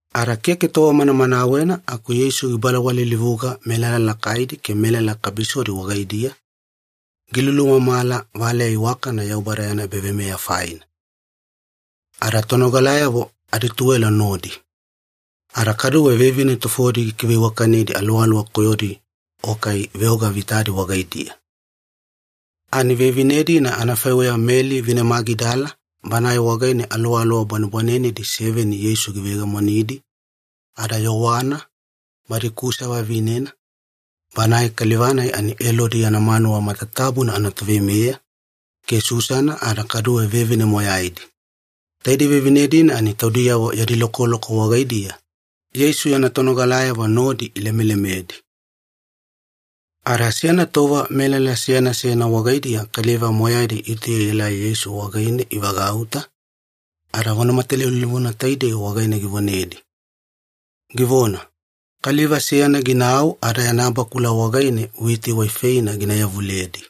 Ada keke tova manamanawena aku Yeisu gibalawalilivuga melala lakaidi ke melala kabisodi wagaidiya, gilulumamala valeya iwakana Yaubada yana ebaveimeya faina. Ada tonogalayavo adituwelo nodi, ada kaduwe vevine tufodi gikiveiwakanedi aluwaluwa koyodi o kai veoga vitadi wagaidiya. Ani vevine-dina anafaiweya Meli vine Magidala banae wagaine aluwaluwa bwanebwanenedi seveni Yeisu giveyegemonidi, ada Yowana badi Kusa vavinena, banae kaliva-nai ani Elodi yana manuwa matatabuna anatoveimeya, ke Susana ada kaduwe vevine moyaidi. Taidei vevine-dina ani taudiyavo yadi lokoloko wagaidiya Yeisu yana tonogalayavo nodi ilemelemedi. Ada seyana tova melala seyana seyana wagaidiya kaliva moyaidi itauya ielai Yeisu wagaine ivagauta, ada vona matalivulivuna taidei wagaine givonedi, givona, “Kaliva seyana ginau ada yana bakula wagaine witi waifeina gina yavuledi.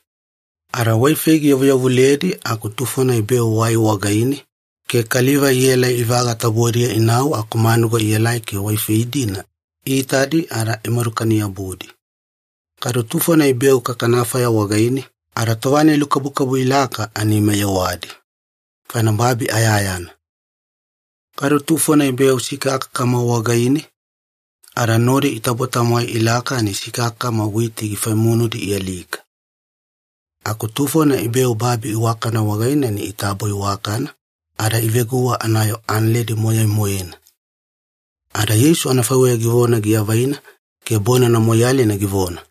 Ada waifei giyavuyavuledi aku tufona ibeu wai wagaine ke kaliva iela ivaga tabodiya inau aku manuga ielai ke waifei-dina iitadi ada imadukani-yabudi. Kadu tufona ibeu kakanafaya wagaine, ada tova-nai ilukabukabu ilaka ani imayewadi, faina babi ayayana. Kadu tufona ibeu sikakakama wagaine, ada nodi itabo-tamwai ilaka ani sikakakama witi gifaimunudi ialika. Aku tufona ibeu babi iwakana wagaine ani itabo iwakana, ada iveguwa anayoo analedi moyai-moena.” Ada Yeisu anafaiweya givona giavaina ke bonana moiyalina givona,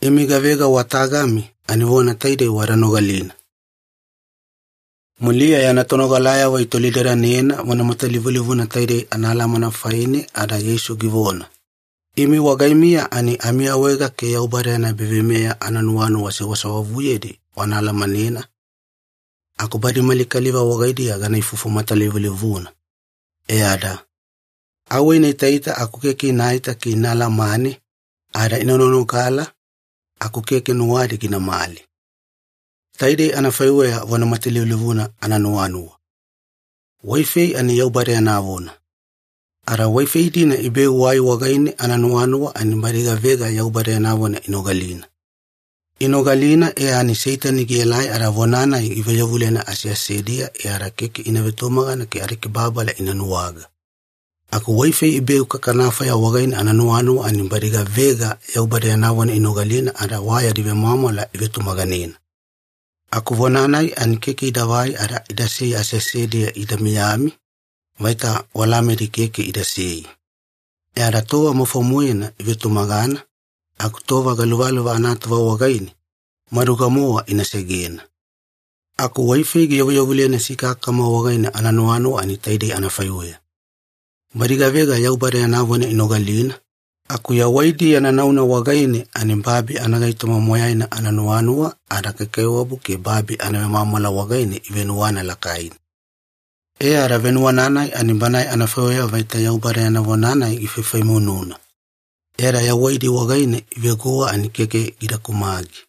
“Imi gavega wa tagami ani vona taidei wada nogalina.” Muliya yana tonogalayavo itolidadanena vona matalivulivuna taidei anaalamana faine ada Yeisu givona, “Imi wagaimiya ani amiawaega ke Yaubada yana ebaveimeya ananuwanuwa sewasewavuyedi wana alamanena, aku badi mali kaliva wagaidiya gana ifufu matalivulivuna, e ada ‘auwe ina itaita aku keke inaita ke ina alamane, ada ina noganogala aku keke nuwadi ginamali.’ “Taidei anafaiweya vona matalivulivuna ananuwanuwa. Waifei ani Yaubada yana vona. Ada waifei-dina ibeu wai wagaine ananuwanuwa ani badi gavega Yaubada yana vona inogalina. Inogalina e ani Seitani gielai ada vona-nai givaiyavulena aseasediya e ada keke ina vetumagana ke adikibababala ina nuwaga. Aku waifei ibeu kakanafaya wagaine ananuwanuwa ani badi gavega Yaubada yana vona inogalina ada wa yadi vemwamwala ivetumaganena. Aku vona-nai ani keke idavai ada idasei aseasediya ida miyami, vaita walamidi keke idasei. E ada tova maufo-moena ivetumagana, aku tova galuvaluva anatova wagaine, maduga-mowa ina segena. Aku waifei giyavuyavulena sikakakama wagaine ananuwanuwa ani taidei anafaiweya. Badi gavega Yaubada yana vona inogalina, aku yawaidi yana nauna wagaine ani babi anagaitoma moyaina ananuwanuwa ada kaikaiwabu ke babi anavemwamwala wagaine ivenuwana lakaina. E ada venuwana-nai ani banae anafaiweya vaita Yaubada yana vona-nai gifaifaimununa, e ada yawaidi wagaine iveguwa ani keke gida kumagi.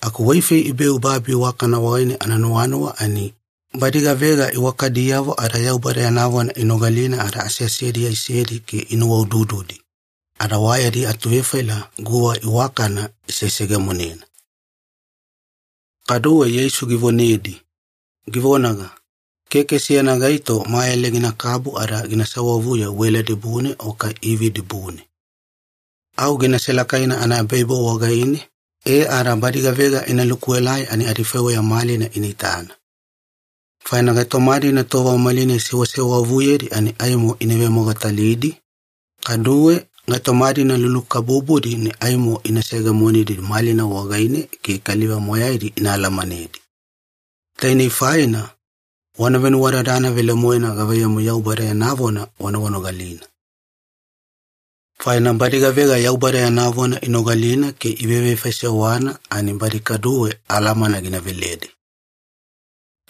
Aku waifei ibeu babi iwakana wagaine ananuwanuwa ani badi gavega iwakadiyavo ada Yaubada yana vona inogalina ada aseasediya isedi ke inuwaudududi, ada wa yadi atuvefaila guwa iwakana iseseyegemonena.” Kaduwe Yeisu givonedi, givonaga, “Keke seyana gaito mayale ginakabu ada gina sewavuye wela dibune o kai ivi dibune. Au gina selakaina anaebaibo wagaine, e ada badi gavega ina lukuelai ani adifaiweya malina ina itana. Faina gaitoma-dina tova malinai sewasewavuyedi ani aimo ina ivemogatalidi, kaduwe gaitoma-dina lulukabubudi ani aimo ina seyegemonedi malina wagaine ke kaliva moyaidi ina alamanedi. Tainei faina wana venuwadadana velemoena gavaiyamu Yaubada yana vona wanoganogalina. Faina badi gavega Yaubada yana vona inogalina ke ivevefaisewana ani badi kaduwe alamana gina veledi.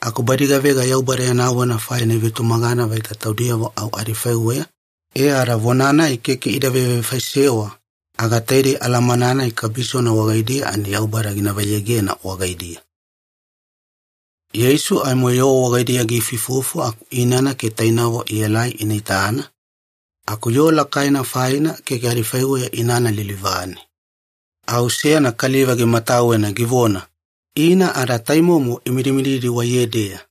Aku badi gavega Yaubada yana vona faina ivetumagana vaita taudiyavo au adifaiweya e ada vona-nai keke ida vevefaisewa, aga taidei alamana-nai kabisona wagaidiya ani Yaubada gina vaiyegena wagaidiya.” Yeisu aimo yoo wagaidiya giifuifufu aku inana ke tainavo ielai ina itana, aku yoo lakaina faina keke adifaiweya inana lilivane. Au seyana kaliva gimatawena givona, “Ina ada taimomo imidimididi waiyedeya.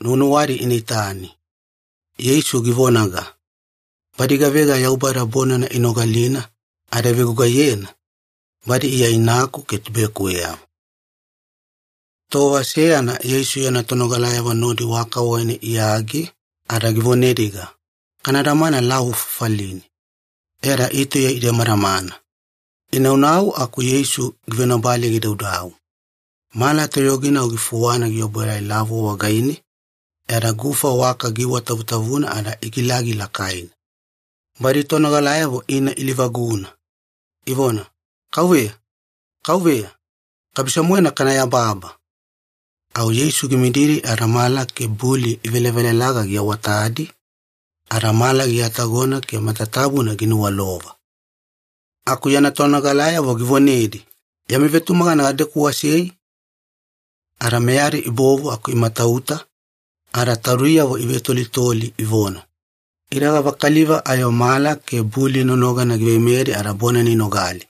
Nuwanuwadi ina itani.” Yeisu givonaga, “Badi gavega Yaubada bonana inogalina ada ivegugaiyena, badi Iya inaku ke tubuiyakuweyavo.” Tova seyana Yeisu yana tonogalayavo nodi waka wagaine iyage, ada givonediga, “Kana damana lavu fafaline.” E ada itauya idamadamana. Inaunau aku Yeisu givenobali gidaudau. Mala toyogina au gifuwa giobuelai lavu wagaine, e ada gufa waka giiwatavutavuna ada igilagi lakaina. Badi tonogalayavo ina ilivaguna, ivona, “Kauveya! Kauveya! Kabiso-moena kana yababa!” Au Yeisu gimididi ada mala ke buli ivelavelalaga giawatadi, ada mala giatagona ke matatabuna giniwalova. Aku yana tonogalayavo givonedi, “Yami vetumagana gadedeku wasei?” Ada meyadi ibovu aku imatauta, ada taudiyavo ivetolitoli ivona, “Ida gavakaliva ayo mala ke buli nonogana giveimeyedi ada bonana inogali!”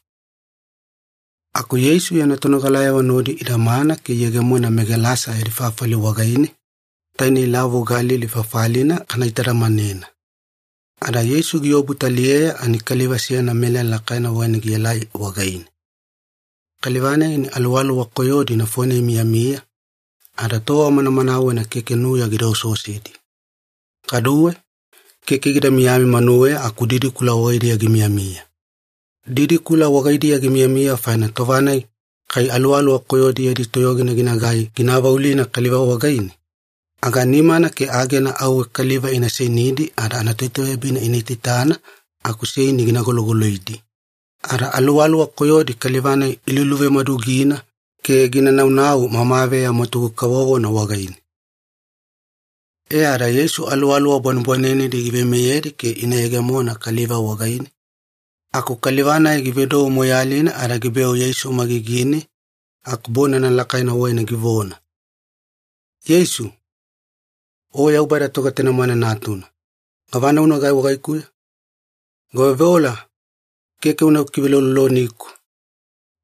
Aku Yeisu yana tonogalayavo nodi idamana ke iyegemona meGelasa yadi fafali wagaine, tainei Lavu Galili fafalina kana itadamanena. Ada Yeisu giobu taliyeya ani kaliva seyana melala lakaina wagaine gielai wagaine. Kaliva-nai ani aluwaluwa koyodi nafone imiyamiya, ada tova manamanawena keke nuya gida oseosedi. Kaduwe, keke gida miyami manuweya aku didikula wagaidiya gimiyamiya. Didikula wagaidiya gimiyamiya faina tova-nai kai aluwaluwa koyodi yadi toyogina ginagai gina avaulina kaliva wagaine, aga nimana ke agena auwe kaliva ina seinidi ada anatoitaveyabina ina itaitana aku seini gina gologoloidi, ada aluwaluwa koyodi kaliva-nai iluluvemadugina ke gina naunau mamaveya mwatugu-kavovona wagaine. E ada Yeisu aluwaluwa bwanebwanenedi giveimeyedi ke ina yegemona kaliva wagaine, aku kaliva-nai givedou moiyalina ada gibeu Yeisu magigine aku bonana lakaina wagaine givona, “Yeisu, O Yaubada Togetane-mwane Natuna, gavana unagai wagaikuya? Gaveoveola keke una kiveulouloloniku!”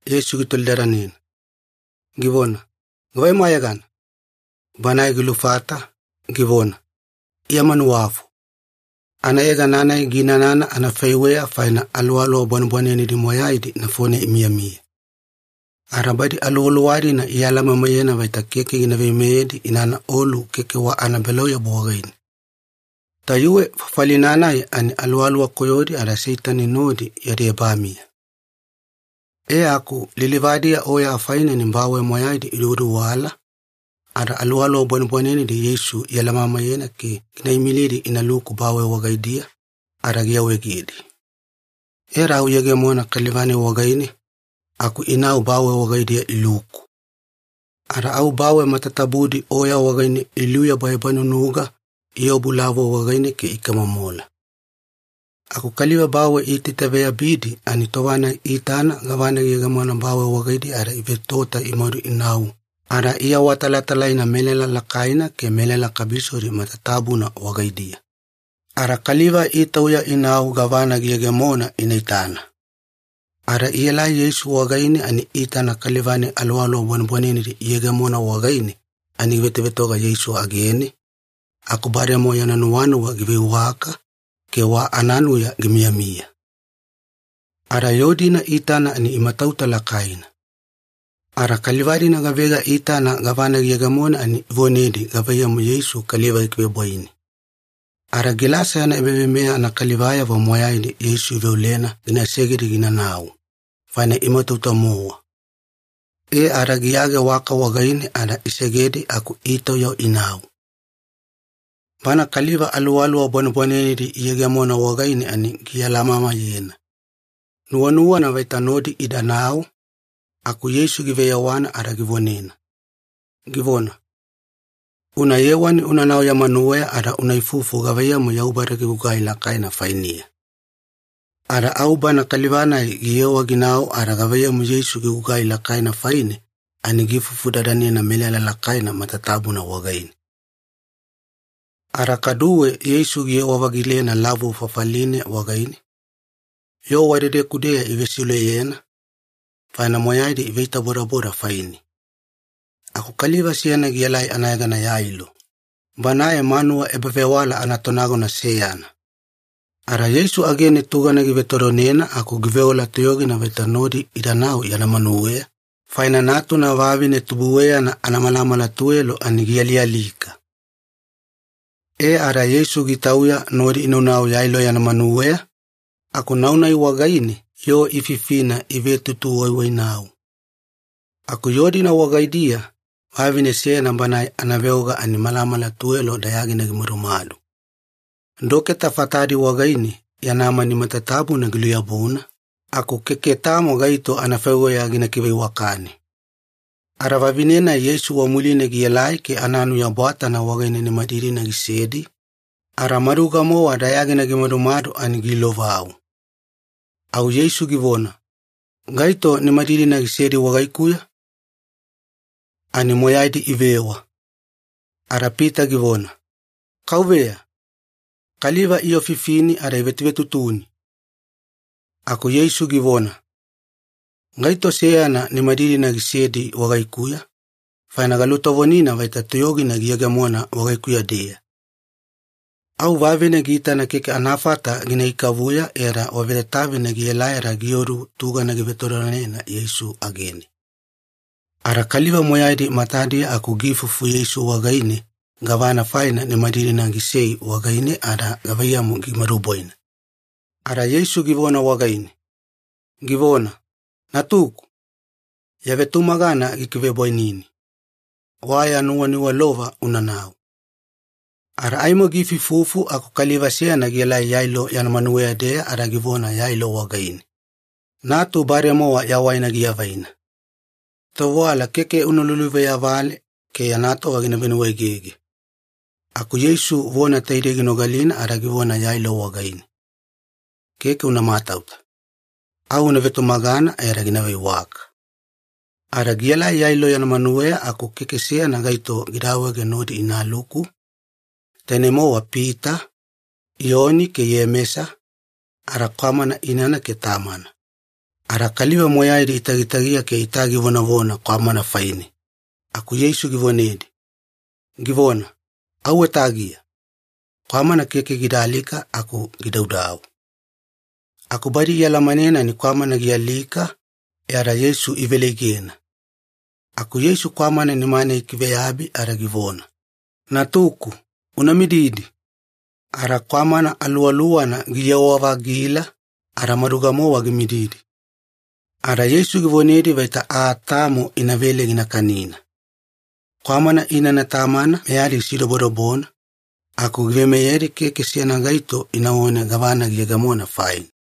Yeisu gitolidadanena, givona, “Gavaiyamu ayegana?” Banae gilufata, givona, “Iya Manuwafo.” Anayegana-nai giinanana anafaiweya faina aluwaluwa bwanebwanenedi moyaidi nafone imiyamiya. Ada badi aluwaluwa-dina ialamamaiyena vaita keke gina veimeyedi inana olu keke wa anaebalauyabu wagaine. Tayuwe fafali-nai ani aluwaluwa koyodi ada Seitani nodi yadi ebamiya. E aku lilivadiya oya afaine ani bawe moyaidi iduwaduwala, ada aluwaluwa bwanebwanenedi Yeisu ialamamaiyena ke gina imilidi inaluku bawe wagaidiya, ada giawaegedi. E ada au iyegemona kaliva-nai wagaine aku inau bawe wagaidiya iluku. Ada au bawe matatabudi oya wagaine iluyabayabanunuga iobu lavu wagaine ke ikamomola. Aku kaliva bawe iitaitaveyabidi ani tova-nai iitana gavana giyegemona bawe wagaidiya ada iveotaota imadu inau ada iawatalatalaina melala lakaina ke melala kabisodi matatabuna wagaidiya. Ada kaliva itauya inau gavana giyegemona ina itana. Ada ielai Yeisu wagaine ani iitana kaliva-nai aluwaluwa bwanebwanenedi iyegemona wagaine ani givetovetoga Yeisu agene, aku bademowa yana nuwanuwa giveiwaka ke wa ananuya gimiyamiya. Ada yoo-dina iitana ani imatauta lakaina. Ada kaliva-dina gavega iitana gavana giyegemona ani ivonedi gavaiyamu Yeisu kaliva gikivebwaini. Ada Gelasa yana ebaveimeya anakalivayavo moyaidi Yeisu iveolena gina segedi ginanau, faina imatauta-mowa. E ada giyage waka wagaine ada isegedi aku itauya inau. Bana kaliva aluwaluwa bwanebwanenedi iyegemona wagaine ani gialamamaiyena, nuwanuwana vaita nodi idanau, aku Yeisu giveyewana ada givonena, givona, “Una yewani unanau ya manuweya ada una ifufu gavaiyamu Yaubada gigugai lakaina fainiya.” Ada au bana kaliva-nai giyewa ginau ada gavaiyamu Yeisu gigugai lakaina faine ani giifufudadanena melala lakaina matatabuna wagaine. Ada kaduwe Yeisu giyewa-vagilena lavu fafaline wagaine, yoo wadedeku-deya ivesiuleyena, faina moyaidi iveitabodaboda faine. Aku kaliva seyana gielai anayegana Yailo, banae manuwa ebavewala anatonagona seyana. Ada Yeisu agene tugana givetodonena aku giveola toyogina vaita nodi idanau yana manuweya, faina natuna vavine tubueyana anamalamala tuwelo ani gialialika. E ada Yeisu gitauya nodi inaunau Yailo yana manuweya, aku nau-nai wagaine yoo ififina ivetutuwaiwainau. Aku yoo-dina wagaidiya vavine seyana banae anaveoga ani malamala tuwelo dayagina gimadumadu. Doketa fatadi wagaine yana mani matatabuna giluyabuna, aku keke tamo gaito anafaiweya gina kiveiwakane. Ada vavine-nai Yeisu wamuline gielai ke ananuya bwatana wagaine nimadidina gisedi, ada maduga-mowa dayagina gimadumadu ani giilovau. Au Yeisu givona, “Gaito nimadidina gisedi wagaikuya?” Ani moyaidi ivewa, ada Pita givona, “Kauveya, kaliva iyoofifini ada ivetuvetutuni!” Aku Yeisu givona, “Gaito seyana nimadidina gisedi wagaikuya, faina galutovonina vaita toyogina giyegemona wagaikuya-deya.” Au vavine giitana keke anafata gina ikavuya e ada wavetatavina gielai ada giodu tugana givetodonena Yeisu agene. Ada kaliva moyaidi matadiya aku giifufu Yeisu wagaine gavana faina nimadidina gisei wagaine ada gavaiyamu gimadubwaina. Ada Yeisu givona wagaine, givona, “Natuku, ya vetumagana gikivebwainini. Wa ya nuwaniwalova unanau.” Ada aimo giifuifufu aku kaliva seyana gielai Yailo yana manuweya-deya ada givona Yailo wagaine, “Natu bademowa yawaina giavaina. Tovewala keke una luluveyavale ke yana tova gina venuwaegege.” Aku Yeisu vona taidei ginogalina ada givona Yailo wagaine, “Keke una matauta. Au una vetumagana ada gina veiwaka.” Ada gielai Yailo yana manuweya aku keke seyana gaito gida awaege nodi inaluku, tainei-mowa Pita, Iyoni ke Iyemesa, ada kwamana inana ke tamana. Ada kaliva moyaidi itagitagiya ke itagi-vonavona kwamana faine, aku Yeisu givonedi, givona, “Auwe tagiya. Kwamana keke gida alika aku gidaudau.” Aku badi ialamanena ani kwamana gialika e ada Yeisu iveleigena. Aku Yeisu kwamana nimane gikiveyabi ada givona, “Natuku, una mididi!” Ada kwamana aluwaluwana giyewa-vagila ada maduga-mowa gimididi. Ada Yeisu givonedi vaita aa tamo inavele gina kanina. Kwamana inana tamana meyadi gisidobodobona, aku giveimeyedi keke seyana gaito inavone gavana giyegemona faina.